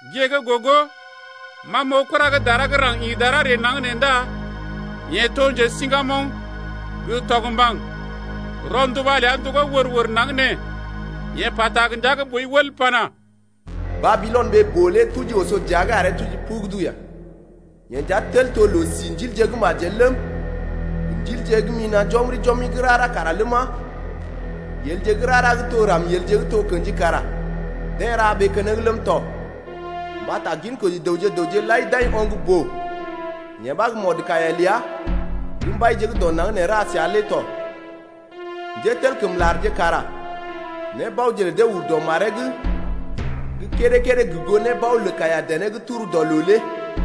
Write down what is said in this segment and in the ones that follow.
Gée gə́ gogo ma m’oo kura gə́ dara gə́ raŋg ḭ dara ree naŋg nee ndá yeḛ to njesiŋgamoŋ gə́ tɔgmbaŋ. Rɔnduba ləa ndogó wər-wər naŋg nee. Yeḛ pata gə ndia gə́ boi wəl pana: Babilɔn, ɓee-boo lé tuji oso dəa’g aree tuji pugudu ya. Yee nja tel to loo-si ndilje gə́ majel ləm, gə ndilje gə́ mina̰ jɔmri-jɔmri gə́ rara kara ləma, yelje gə́ rara gə́ to ramielje gə́ to kḛji kara deḛ ra ɓee keneŋ ləm tɔ. Mbata ginkoji dəwje gə raŋg lai d’ai oŋg-boo, yee ɓa gə́ mɔdkaiya ləa gə́ mbaije gə́ dɔ naŋg nee ra səa lé tɔ. Njételkəmlarje kara nébaoje lə dee ur dɔ maree’g gə́ kédé-kédé gə goo nébao lə kaiya-dené gə́ turu dɔ loo lé.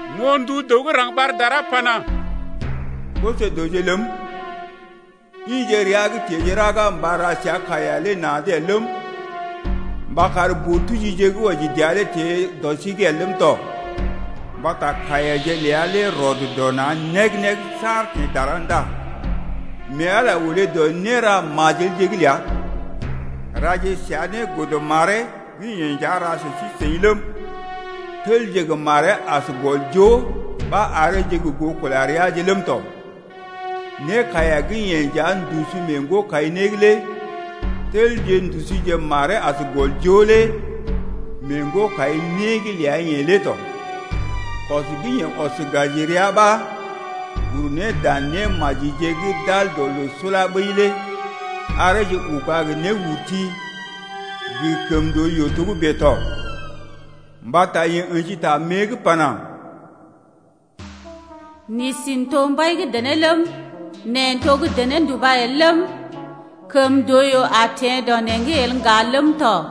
M’oo ndu dəw gə́ raŋg ɓar dara pana: Koso-dəwje ləm, ḭje rəa’g teḛje raga mba ra səa kaiya lé na̰’d el ləm, mba kar boo-tujije gə́ wɔji dəa lé teḛ dɔ sí’g el ləm tɔ. Mbata kaiyaje ləa lé rɔd dɔ na̰ neg-neg saar teḛ dara ndá mee Ala olé dɔ néra majelje’g ləa. Raje səa né godə maree gə́ yeḛ nja ra sə sí-seḭ ləm, telje gə maree as gɔl joo ɓa areeje gə goo kula reaje ləm tɔ. Nékaiya gə́ yeḛ nja ndusu mee ŋgo-kai-né’g lé telje ndusuje maree as gɔl joo lé mee ŋgo-kai-né’g ləa-yeḛ lé tɔ. Kɔs gə́ yeḛ ɔs gaji rəa ɓa uru ne dan némajije gə́ d’al dɔ loo sula ɓəi lé areeje uga gə néurti gə kəmndooyoo togə́bè tɔ. Mbata yeḛ ə̰ji ta mée’g pana: N’isi n’to mbai gə́ dené ləm, neḛ n’to gə́ dené nduba el ləm, kəmndooyoo a teḛ dɔ neḛ’g el ŋga ləm tɔ.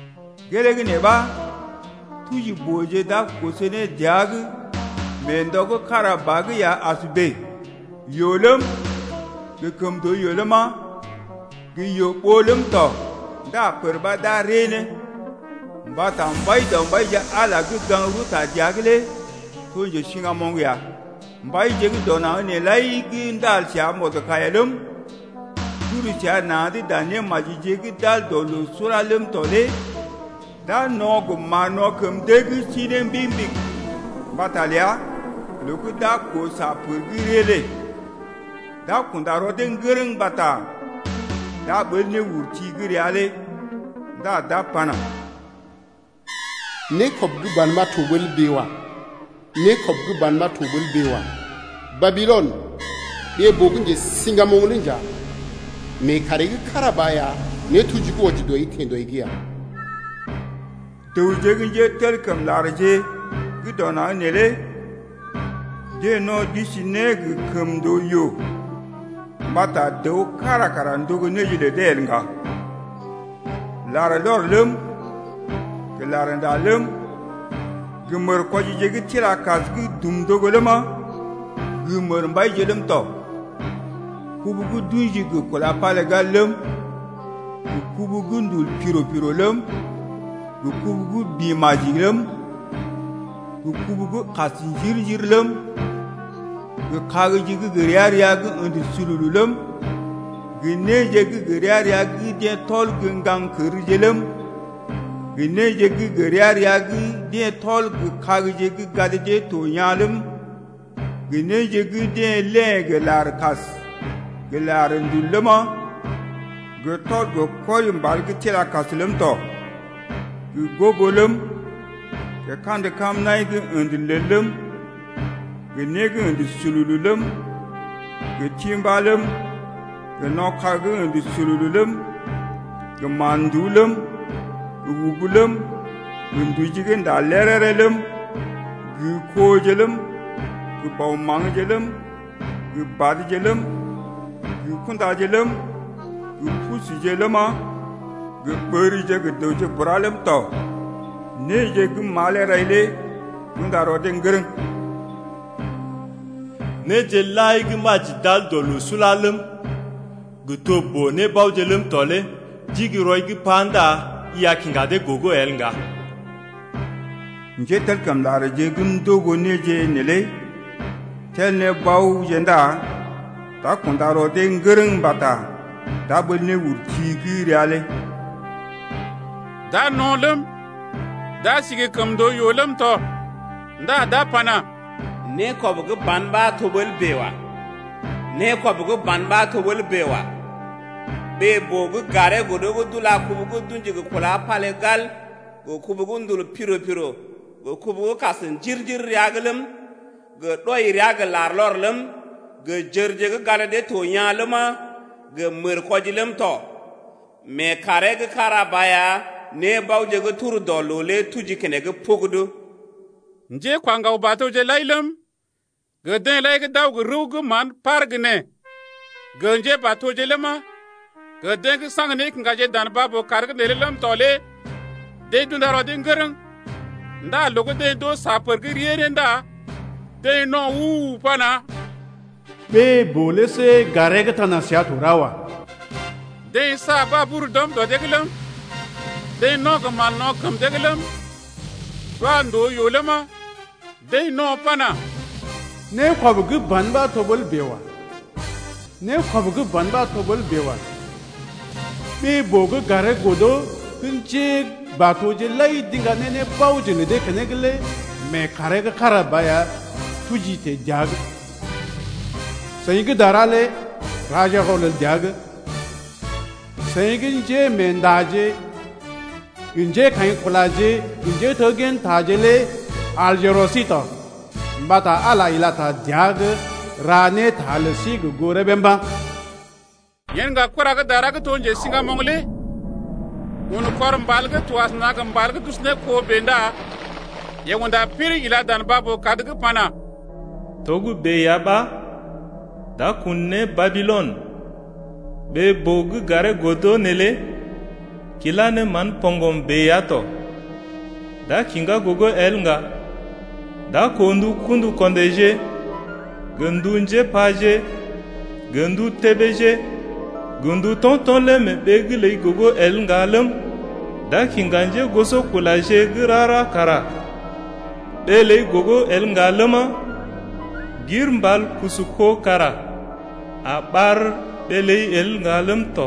Gelee gə́ nee ɓa tuji-booje d’a koso ne dəa’g mee ndɔ gə́ kára ba’g ya as bèe: yoo ləm, gə kəmndooyoo ləma, gə yoo-ɓoo ləm tɔ ndá pər ɓa d’a rée ne. Mbata Mbaidɔmbaije Ala gə́ njesiŋgamoŋ lé gaŋg rəwta dəa’g ya. Mbaije gə́ dɔ naŋg nee lai gə́ ndal səa mɔdkaiya ləm, d’uru səa na̰’d dan némajije gə́ d’al dɔ loo sula ləm tɔ lé d’a no̰ gə mán-no̰ kəm dee’g sii ne mbigi-mbigi mbata ləa loo gə́ d’a koo sa pər gə́ rée lé. D’a kunda rɔ dee ŋgərəŋ mbata d’a ɓəl néurti gə́ rəa lé ndá d’a pana: Nékɔb gə́ ban ɓa to ɓəl bèe wa! Nékɔb gə́ ban ɓa to ɓəl bèe wa! Babilɔn, ɓee-boo gə́ njesiŋgamoŋ lé nja! Mee kàree gə́ kára ba ya nétuji gə́ wɔji dɔi teḛ dɔi’g ya. Dəwje gə́ njételkəmlarje gə́ dɔ naŋg neelé deḛ no̰ d’isi ne gə kəmndooyoo mbata dəw kára kara ndogo néje lə dee el ŋga. Larlɔr ləm, gə larnda ləm, gə mərkwɔjije gə́ tila kas gə́ dum ndogo ləma, gə mərmbaije ləm tɔ, kubu gə́ d’ṵji gə kúla palégal ləm, gə kubu gə́ ndul piro-piro ləm, gə kubu gə́ bḭ-maji ləm, gə kubu gə́ kas njir-njir ləm, gə kagje gə́ gə ria-ria gə́ ə̰də sululu ləm, gə néje gə́ gə ria-ria gə́ deḛ tɔl gə ŋgaŋ kərje ləm, gə néje gə́ gə ria-ria gə́ deḛ tɔl gə́ kagje gə́ gad dee to yaa̰ ləm, gə néje gə́ deḛ léḛ gə́ larkas gə larndul ləma, gə tɔl gə kɔri mbal gə́ tila kas ləm tɔ 3gə gobo ləm, gə kandə kamnaḭ gə́ ə̰də lel ləm, gə né gə́ ə̰də sululu ləm, gə timbá ləm, gə no̰ kag gə́ ə̰də sululu ləm, gə mán-nduú ləm, gə ubu ləm, gə nduji gə́ ndá léréré ləm, gə koje ləm, gə bɔ maŋgje ləm, gə badje ləm, gə kundaje ləm, gə pusuje ləma, gə ɓərje gə dəwje bura ləm tɔ. Néje gə́ malee rai lé d’unda rɔ dee ŋgərəŋ. Néje lai gə́ maji d’al dɔ loo sula ləm, gə́ to boo-nébaoje ləm tɔ lé d’igi rɔi’g pa ndá i a kiŋga dee gogo el ŋga. Njételkəmlarje gə́ ndogo néje neelé tel ne baoje ndá d’a kunda rɔ dee ŋgərəŋ mbata d’a ɓəl néurti gə́ rəa lé. D’a no̰ ləm, d’a sí gə kəmndooyoo ləm tɔ ndá d’a pana: Nékɔb gə́ ban ɓa to ɓəl bèe wa! Nékɔb gə́ ban ɓa to ɓəl bèe wa! Ɓee-boo gə́ garee godo gə́ d’ula kubu gə́ d’ṵji gə kúla palégal gə kubu gə́ ndul piro-piro gə kubu gə́ kas njir-njir rəa’g ləm, gə́ ɗɔi rəa gə́ larlɔr ləm, gə jərje gə́ gad dee to yaa̰ ləma, gə mərkwɔji ləm tɔ. Mee kàree gə́ kára ba ya nébaoje gə́ tur dɔ loo lé tuji keneŋ pugudu. Njékwa ŋgaw-batoje lai ləm, gə deḛ lai gə́ d’aw gə rəw gə́ mán gə́ par gə́ nee, gə njébatoje ləma, gə deḛ gə́ saŋg nékiŋgaje dan baa-boo-kad’g neelé ləm tɔ lé deḛ d’unda rɔ dee ŋgərəŋ 8ndá loo gə́ deḛ d’oo sa pər gə́ rée ne ndá deḛ no̰ u-u-u pana: Ɓee-boo lé see garee gə́ tana səa to ra wa. Deḛ sa babur d’ɔm dɔ dee’g ləm, deḛ no̰ gə mán-no̰ kəm dee’g ləm, d’wa ndòo-yoo ləma, deḛ no̰ pana: Nékɔb gə́ ban ɓa to ɓəl bèe wa! Nékɔb gə́ ban ɓa to ɓəl bèe wa! Ɓee-boo gə́ garee godo gə́ njébatoje lai d’iŋga ne boo-nébaoje lə dee keneŋ lé mee kàree gə́ kára ba ya tuji teḛ dəa’g. Seḭ gə́ dara lé raje rɔlel dəa’g! Seḭ gə́ njémeendaje gə njékaḭkulaje gə njéteggintaje lé alje rɔ sí to! Mbata Ala ila ta dəa’g ra ne ta lə sí gə goo rəbee mba̰. Yen ŋga kura gə́ dara gə́ to njesiŋgamoŋ lé un kɔr mbal gə́ to asəna gə mbal gə́ d’usu ne kó bèe ndá yeḛ unda piriŋ ila dan baa-boo-kad’g pana: Togə́bè ya ɓa, d’a kun ne Babilɔn, ɓee-boo gə́ garee godo neelé kila ne mán poŋgm bèe ya tɔ. D’a kiŋgá gogo el ŋga. D’a koo ndu kṵdu-ko̰déje gə ndu njépaje gə ndu tébéje gə ndu to̰to̰ lé mee ɓee’g ləi gogo el ŋga ləm, d’a kiŋga njégosokulaje gə́ rara kara ɓee ləi gogo el ŋga ləma, gir mbal kusu kó kara a ɓar ɓee ləi el ŋga ləm tɔ.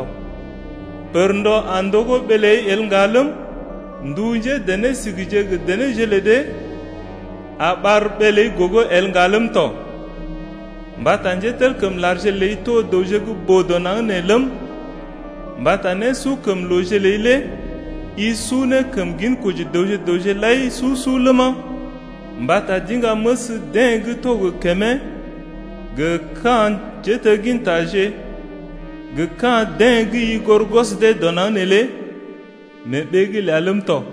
Pərndɔ a ndogó ɓee ləi el ŋga ləm, ndu njédené sigije gə denéje lə dee a ɓar ɓee’g ləi gogo el ŋga ləm tɔ, mbata njételkəmlarje ləi to dəwje gə́ boo dɔ naŋg nee ləm, mbata nésukəmlooje ləi lé i su ne kəm ginkoji dəwje gə raŋg lai su-su ləma, mbata d’iŋga məs deḛ gə́ to gə kəmee gə ka̰ njéteggintaje gə ka̰ deḛ gə́ i goré gwɔs dee dɔ naŋg neelé lé mee ɓee’g ləi ləm tɔ.